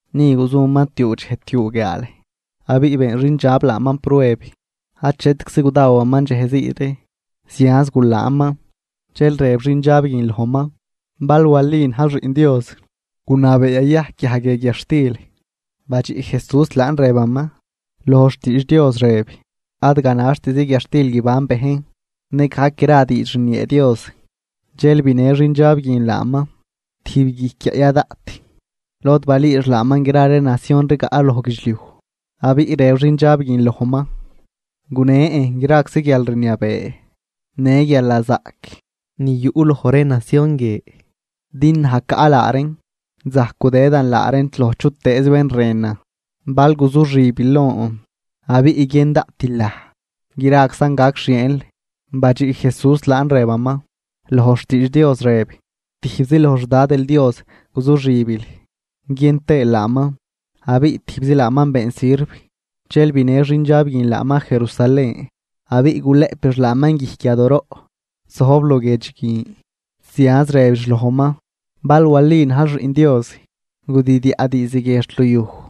Ni guzuman tiuu dxej tiuu guiaal, abiꞌ been xindxab laaman prueb. Achetczi gudawaman dxej zii ree, zianz gulaanman. Dxel rëb xindxab guin lojman: ―Bal wali najl Xiꞌn Dios, gunabee yayajc guiaj guie guiadxtil. Badxiꞌ Jesús laan rëbaman: ―Loj xtiidx Dios rëb: “Ad ganaxtizi guiadxtil guiban bejn, nëgajc gra diidx rniee Dios.” Dxel binë xindxab guin laaman tijb guijc guiaꞌ ya daꞌt, lod balüüx laaman gra ree nacion rigaꞌ loj guidxliuj. Abiꞌ rëb xindxab guin lojman: ―Gunen graczi guialrniabee në guialnazaꞌc ni yuꞌ loj ree nacion guie. Din naj caꞌ laa reen, zajc gudëdan laa reen loj chutëëz bén rënan. Bal guzuxibil lon abiꞌ guiën daꞌtil naj, graczan gac xieenl. Badxiꞌ Jesús laan, rëbaman: ―Loj xtiidx Dios rëb: “Tijbzi loj xDadil Dios guzuxibil guiën tëël laaman, abiꞌ tijbzi laaman been sirv.” Dxel binë xindxab guin laaman Jerusalén, abiꞌ gulëꞌpix laaman guijc yadooroꞌ zojb luguiedx guin. Zianz rëbix lojman: ―Bal wali najl Xiꞌn Dios, gudidyaꞌ diizd guie xt luyuj,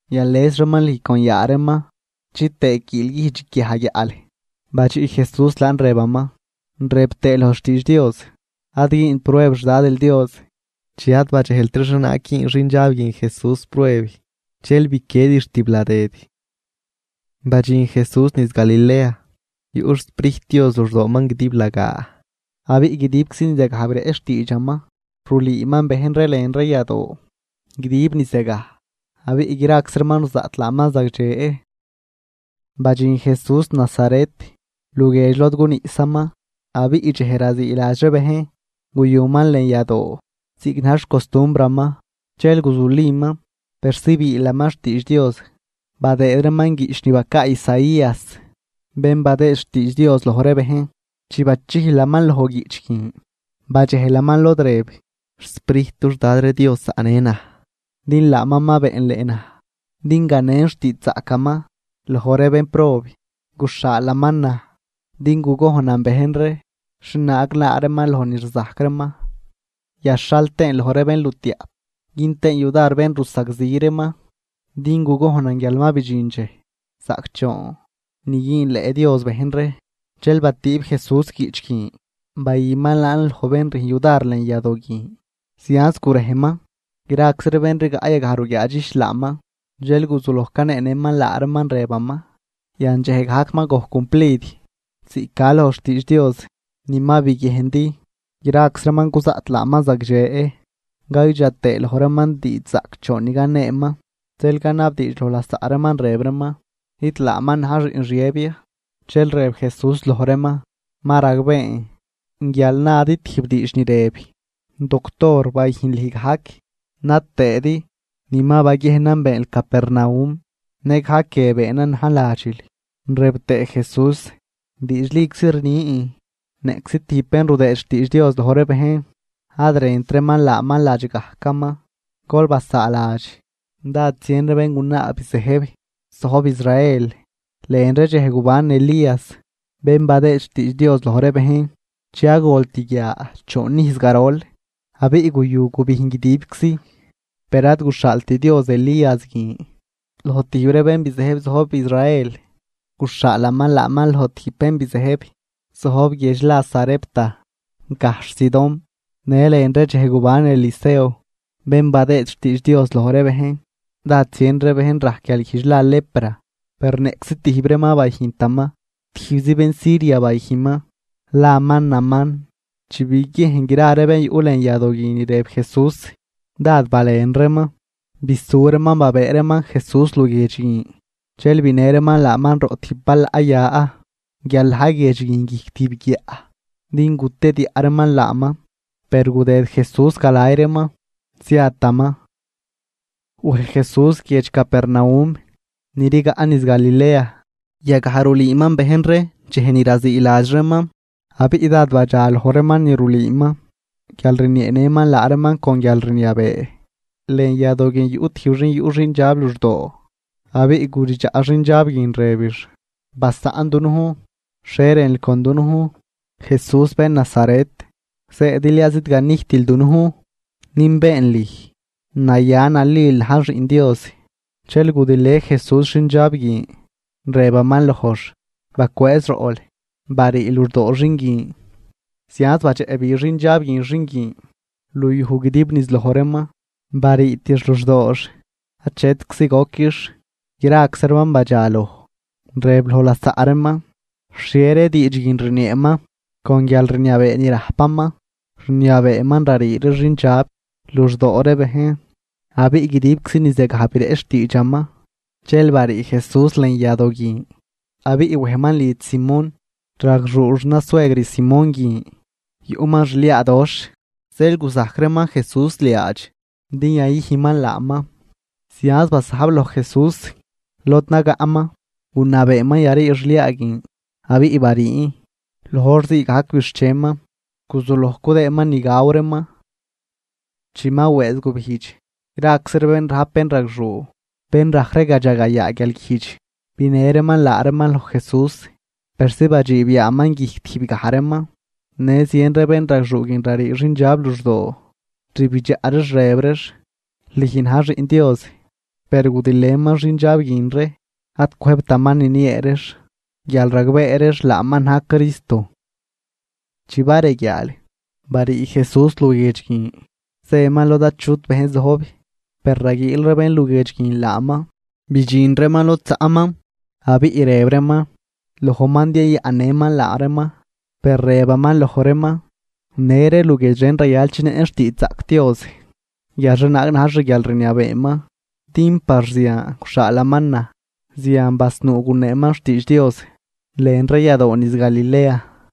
Yales reeman lüj con yaa reeman, chitëë quiilguijdx guiaj guiaꞌl. Badxiꞌ Jesús laan rëbaman: ―Rëb tëë loj xtiidx Dios: “Ad güünl prueb xDadil Dios.” Chi ad badxejltri xhienaag güün xindxab guin Jesús prueb, dxel biquiedix tibladëd. Badxin Jesús niz Galilea, yuꞌ xSprijt Dios luxdooman guidiblagaa, abiꞌ guidibczi niz yagaj bireꞌch xtiidxaman. Rulüüman bejn ree lën ree yadoo guidib niz yagaj, abiꞌ graczi reeman ruzaꞌt laaman zagdxe. Badxin Jesús Nazaret luguiedx lod guniꞌsaman. Abiꞌ dxej raziiladx ree bejn guyuman lën yadoo ziꞌc na̱j xcostumbraman. Dxel guzuliman persi biilaman xtiidx Dios. Badëëd reeman guiꞌch ni bacaa Isaías bén badëë xtiidx Dios loj ree bejn. Chi bachijlaman loj guiꞌch guin, badxejlaman lod rëb: XSprijt dux Dad ree Dios zaꞌnë naj, din laaman ma beenleꞌ naj din ganen xtiidxzaꞌcaman loj ree bénprob. Guxhaalaman naj din gugojnan bejn ree xhienaag laa reeman loj ni rzajc reeman, yaxhal tëën loj ree bénlutiaꞌp. Gün tëën yudar bén rusagzi reeman, din gugojnan guial ma bidxin dxej zaꞌcdxoon ni güünleꞌ Dios bejn ree. Dxel batüüb Jesús guiꞌch guin bayüman laan loj bén rüjn yudar lën yadoo guin, zianz gurejman. Graczi ree bén rigaꞌ yagaj ruguiaadxijch laaman. Dxel guzuloj caneenëman laa reeman, rëbaman: ―Yan dxej gajc ma gojc cumplid ziꞌc ca loj xtiidx Dios ni ma biguiejndi. Graczi reeman cuzaꞌt laaman zagdxe caydxa tëë loj reeman diidxzaꞌcdxoon ni caneeman. Dxel canabdiidx loj lasaꞌ reeman rëb reeman: ―¿Nid laaman na̱j xiꞌn Xiëb ya? Dxel rëb Jesús loj reeman: ―Ma ragbeen guial nadi tijb diidx ni rëb: “Doctor, bayüjn lüj gajc”, na tëëdi: “Ni ma baguiejnan beenl Capernaum nëgajc guie beenan najn ladxil.” Rëb tëë Jesús: ―Diidxliczi rnin, niꞌczi tijb bén rudëë xtiidx Dios loj ree bejn, ad rënt reeman laaman ladx gajcaman. Gol basaaladx dád zien ree béngunaa bizëjb zojb Israel lën ree dxej guban Elías bén badëë xtiidx Dios loj ree bejn, chi ad golt guia choon ijz garol, abiꞌ guyu gubijn guidibczi. Per ad guxhaalt Dios Elías guin loj tijb ree bén bizëjb zojb Israel, guxhaalaman laaman loj tijb bén bizëjb zojb guiedx la Sarepta, gajxh Sidón. Në lën ree dxej guban Eliseo bén badëë xtiidx Dios loj ree bejn, dád zien ree bejn rajc guialguijdx la lepra, per niꞌczi tijb reeman ad bayüjntaman, tijbzi bén Siria bayüjnman laman Naamán. Chi biguiejn gra ree bén yuꞌ lën yadoo guin ni rëb Jesús, dád balen reeman. Bisu reeman babëë reeman Jesús luguiedx guin, dxel binë reeman laaman roꞌ tijb balaꞌ ya guial na̱j guiedx guin guijc tijb guiaꞌ, din gutediaꞌ reeman laaman. Per gudëd Jesús galay reeman, ziataman. Wej Jesús guiedx Capernaum ni rigaꞌ niz Galilea, yagaj rulüüman bejn ree dxej ni raziiladx reeman. Abiꞌ dád badxaloj reeman ni rulüüman guial rnieenëman laa reeman con guialrniabee. Lën yadoo guin yuꞌ tijb xin yuꞌ xindxab luxdoo, abiꞌ guridxaꞌ xindxab guin rëbix: ―Basaꞌn dunujn, ¿xhie rënl con dunujn, Jesús bén Nazaret? ¿Zëëdil ya zidganijtil dunujn? Nünbeen lüj, naya nalil najl xiꞌn Dios. Dxel gudilë Jesús xindxab guin, rëbaman lojx: ―¡Bacwëëz roꞌl, barii luxdoo xin guin! Zianz badxeꞌbi xindxab guin xin guin luyuj guidib niz loj reeman, bariitix luxdoox achetczi goquix. Graczi reeman badxaloj, rëb loj lasaꞌ reeman: ―¿Xhie ree diidx guin rnieeman? ¡Con guialrniabee ni rajpaman, rniabeeman rarii ree xindxab luxdoo ree bejn! Abiꞌ guidibczi niz yagaj bireꞌch xtiidxaman. Dxel barii Jesús lën yadoo guin, abiꞌ wejman lidx Simón. Ragxuu xnasuegr Simón guin yuꞌman xliaadoxh zeel guzajc reeman Jesús liaadx din yayüjnman laaman. Zianz basajb loj Jesús lod nagaꞌman gunabeeman yarii xliaa guin, abiꞌ bariin. Loj hor ziigajc bixcheman guzuloj cudëëman ni gaw reeman. Chi ma wëëz gubijdx, graczi ree bén rajp bénragxuu bén rajc ree gadxagayaa guialguijdx binë reeman laa reeman loj Jesús, persi badxiib yaaman guijc tijb gaj reeman, bayüjnman laa reeman. Në zien ree bénragxuu guin rarii xindxab luxdoo, rbidxaꞌ reex rëb reex: ―¡Lüj na̱j Xiꞌn Dios! Per gudilëman xindxab guin ree, ad cwëjbtaman niniee reex, guial ragbee reex laaman na̱j Cristo. Chi bareguiaal, barii Jesús luguiedx guin zëman lod achut bejn zojb. Per raguiil ree bénguiedx guin laaman, bidxin reeman lod zaꞌman abiꞌ rëb reeman lojman din yayaꞌnnëman laa reeman. Per rëbaman loj reeman: ―Në ree luguiedx ren rayal chinëꞌn xtiidxzaꞌc Dios guial xhienaag na̱j xguialrniabeeman, din par zian guxhaalaman naj. Zian basnuu guneeman xtiidx Dios lën ree yadoo niz Galilea.